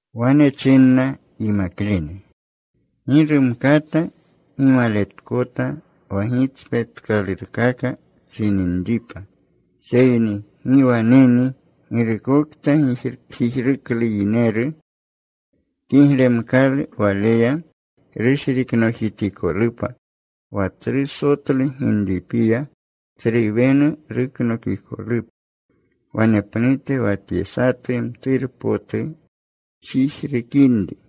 Wane chinna yimaklene, “Gi rumkata gimaletkota wa gitspetkalurkaka chininripa. Seyni ¡gi waneni girukokta jijruklu yineru! Kiglemkalu waleya rushriknojitikolupa wa tsru sotlu ginripiya, tsru wenu ruknokikolupa, wanepnute wa tye satu mturpotu jijrukinri.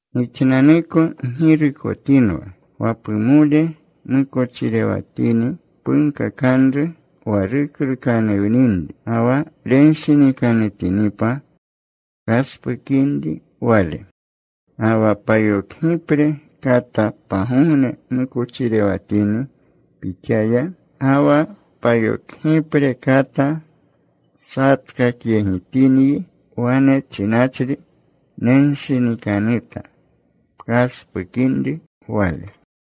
“Gixnanuko ggirukotinwa. Wa pumole mukochirewatini punkakanru wa ruklukanuwninri. Ga wa renshinikanutinipa, pkaspukinri wale. Ga wa payokgipre kata pagogne mukochirewatini pixaya, ga wa payokgipre kata satkakyegitinyi wane chinachri, ‘Nenshinikanuta,’ pkaspukinri wale.”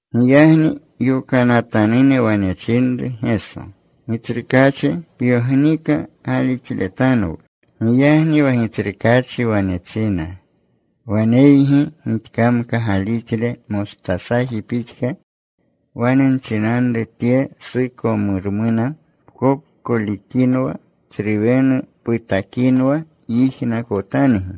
Giyagni yokanatanune wane chinru Geso, “Gitsrukaachi, pyognika galixletanwu.” Giyagni wa Gitsrukaachi wane china, “Waneygi gixkamka galixle mostasaji pixka, wane nchinanru tye sukomormuna, ‘Pkopkolikinwa. Tsru wenu putakinwa.’ Yijnakotangi.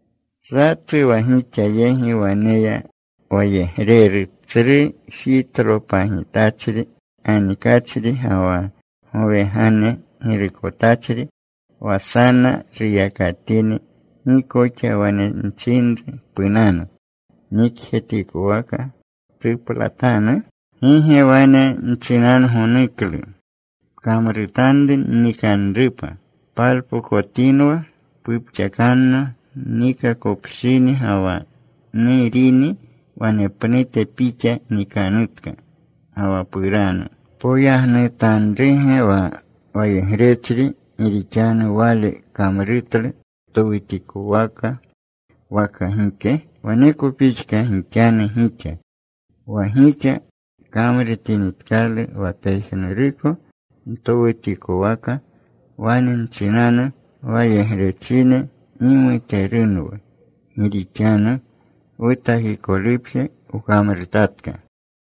“¿Satu wa gixa yegi waneya wayegreru tsru jitlolepagitachri ganikachri ga wa gowegane girukotachri, wa sana ruyakatini, gi koxa wane nchinru, ‘Punanu. Nikjetikowaka ptuplatanu?’ “¿Gi ge wane nchinangonuklu, ‘Pkamrutanru nnikanrupa. Palpokotinwa. Pupxakanno nnikakopshini ga wa nurini. Wanepnute pixa nikanutka ga wa puranu’? “¿Poyagnutanruge wa wayegrechri gi rixanu wale kamrutlu towutikowaka waka gike? Waneko pixka gixanu gixa. Wa gixa kamrutinitkalu wa pejnuruko ntowutikwaka, wane nchinanu, ‘Wayegrechine gimuterunwu, gi rixanu wutakikolupje wkamrutatka.’”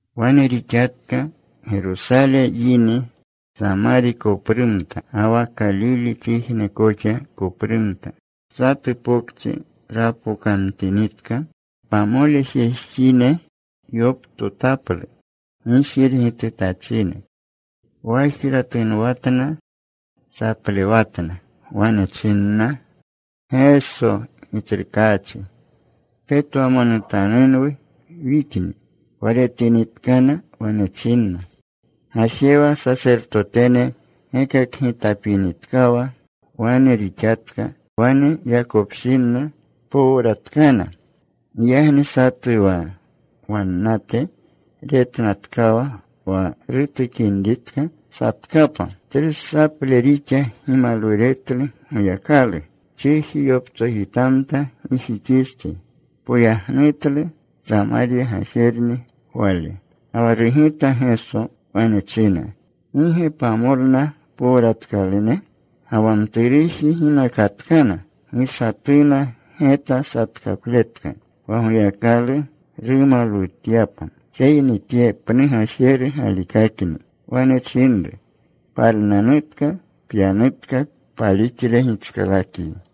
Wane rixatka. Gerosale yini, Samari koprumta ga wa Kalilechijne koxa koprumta. Satu pokchi rapokamtinitka, pamole jejine yoptotaplu gijirgitutachine. Wajra tunwatna. Saplewatna. Wane chinna, “Geso, Gitsrukaachi, petwamonutanunwu wixni.” Wa retinitkana wane chinna, “Gajewa. Sasertotene gekakgitapinitkawa.” Wane rixatka. Wane yakopshinna powratkana. Giyagni satu wa wannate retnatkawa wa rutukinritka, satkapa. Tsru saple rixa gimalwuretlu Goyakalu. Chiji yoptsojitamta gijixistsi. Poyagnutlu. Samarya gajerni wale. Ga wa rugita Geso. Wane china, “¿Gi ge pamolna powratkalune? Ga wa mturuji ¿ginakatkana? Gi satuna geta satkapletka wa Goyakalu rumalwutyapa, seyni tye pnu gajeru galikakni.” Wane chinru, “Palnanutka. Pyanutka. Palixle gitskalakyi.”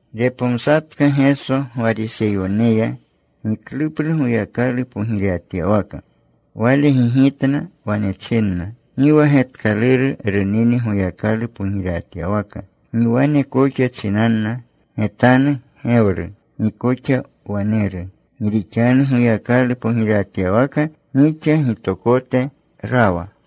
Repomsatka Geso Gwariseyoneya gikluplu Goyakalu pogirewatyawaka. Wale gigitna. Wane chinna, “Gi wa getkaluru runini Goyakalu pogirewatyawaka. Gi wane koxa chinanna, ‘Getanu. Gewru.’ Gi koxa, ‘Waneru.’ Gi rixanu, Goyakalu pogirewatyawaka gixa gitokote rawa.”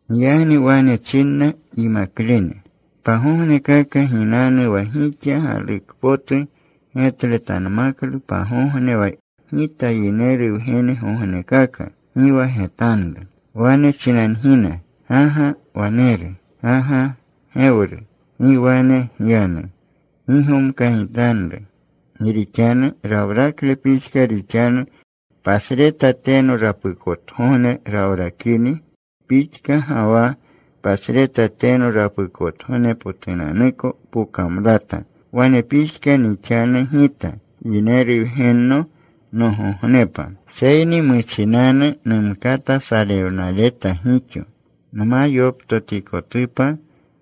Giyagni wane chinna yimaklene, “Pagognekaka ginanu wa gixa galukpotu getletanmaklu pagogne wa Gita Yineru Wgennogognekaka. Gi wa getanru. Wane chinangina, ‘Ga ga waneru.’ ‘Ga ga gewru.’ Gi wane gyanu. Gi gomkagitanru. Gi rixanu rawrakle pixka rixanu pasreta teno rapukotgogne rawrakini pixka ga wa pasreta teno rapukotgognepotunanuko pokamlata. Wane pixka nixanu Gita Yineru Wgenno nogognepa. Seyni muchinanu numkata salewnaleta gixo, nma yoptotikotupa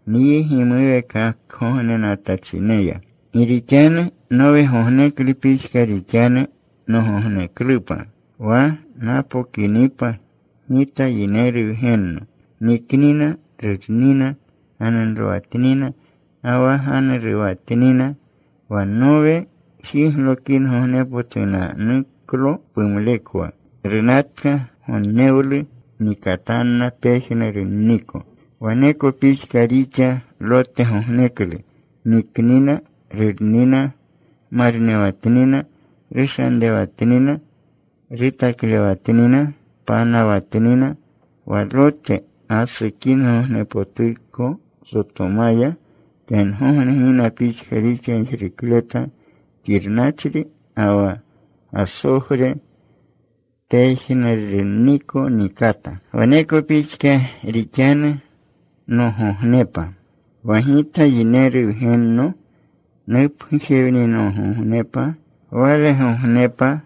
nyi gimuweekakgognenatachineya. “Gi rixanu Nowegogneklu pixka rixanu nogogneklupa wa napokinipa Gita Yineru Wgenno. Niknina, rurnina, ganunrowatnina ga wa ganuruwatnina, wa Nowe jiglokingognepotunanuklo pumlekwa. Runatka gonnewlu. Nikatanna pejnurunniko. “Waneko pixka rixa Lotgogneklu. Niknina, rurnina, marnewatnina, rushanrewatnina, rutaklewatnina, panawatnina. Wa Lote gasukingognepotuko Sotomaya, tengogne gina pixka rixa gijrukleta xirnachri ga wa gasogre. Pejnurunniko nikata. “Waneko pixka rixanu nogognepa, wa Gita Yineru Wgenno nupgujewninigognepa. Walegognepa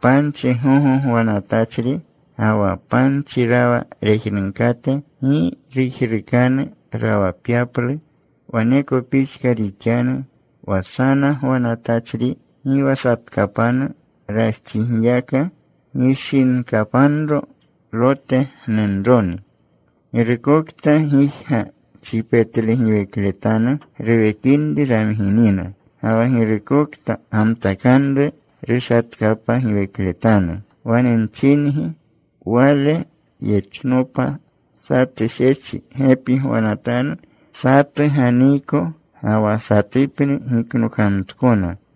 panchi gogo gwanatachri ga wa panchi rawa rejnunkate, gi rujrukanu rawapyaplu. Waneko pixka rixanu wa sana gwanatachri, gi wa satkapanu rajxigiyaka. Gishinkapanro Lote gnunroni. “Girukokta gijga chipetlegiwekletanu ruwekinri ramginina. Ga wa girukokta gamtakanru, rushatkapgiwekletanu. Wane nchingi, wale yechnopa, satu shechi gepi gwanatanu. Satu ganiiko, ga wa satupni giknokamtkona.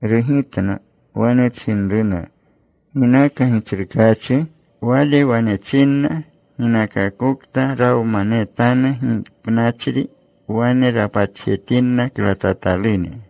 Rugitna. Wane chinruna, “¿Ginaka, Gitsrukaachi?” Wale wane chinna, “Ginakakokta rawmanetanu gipnachri wane rapatjetinna klatatalune.”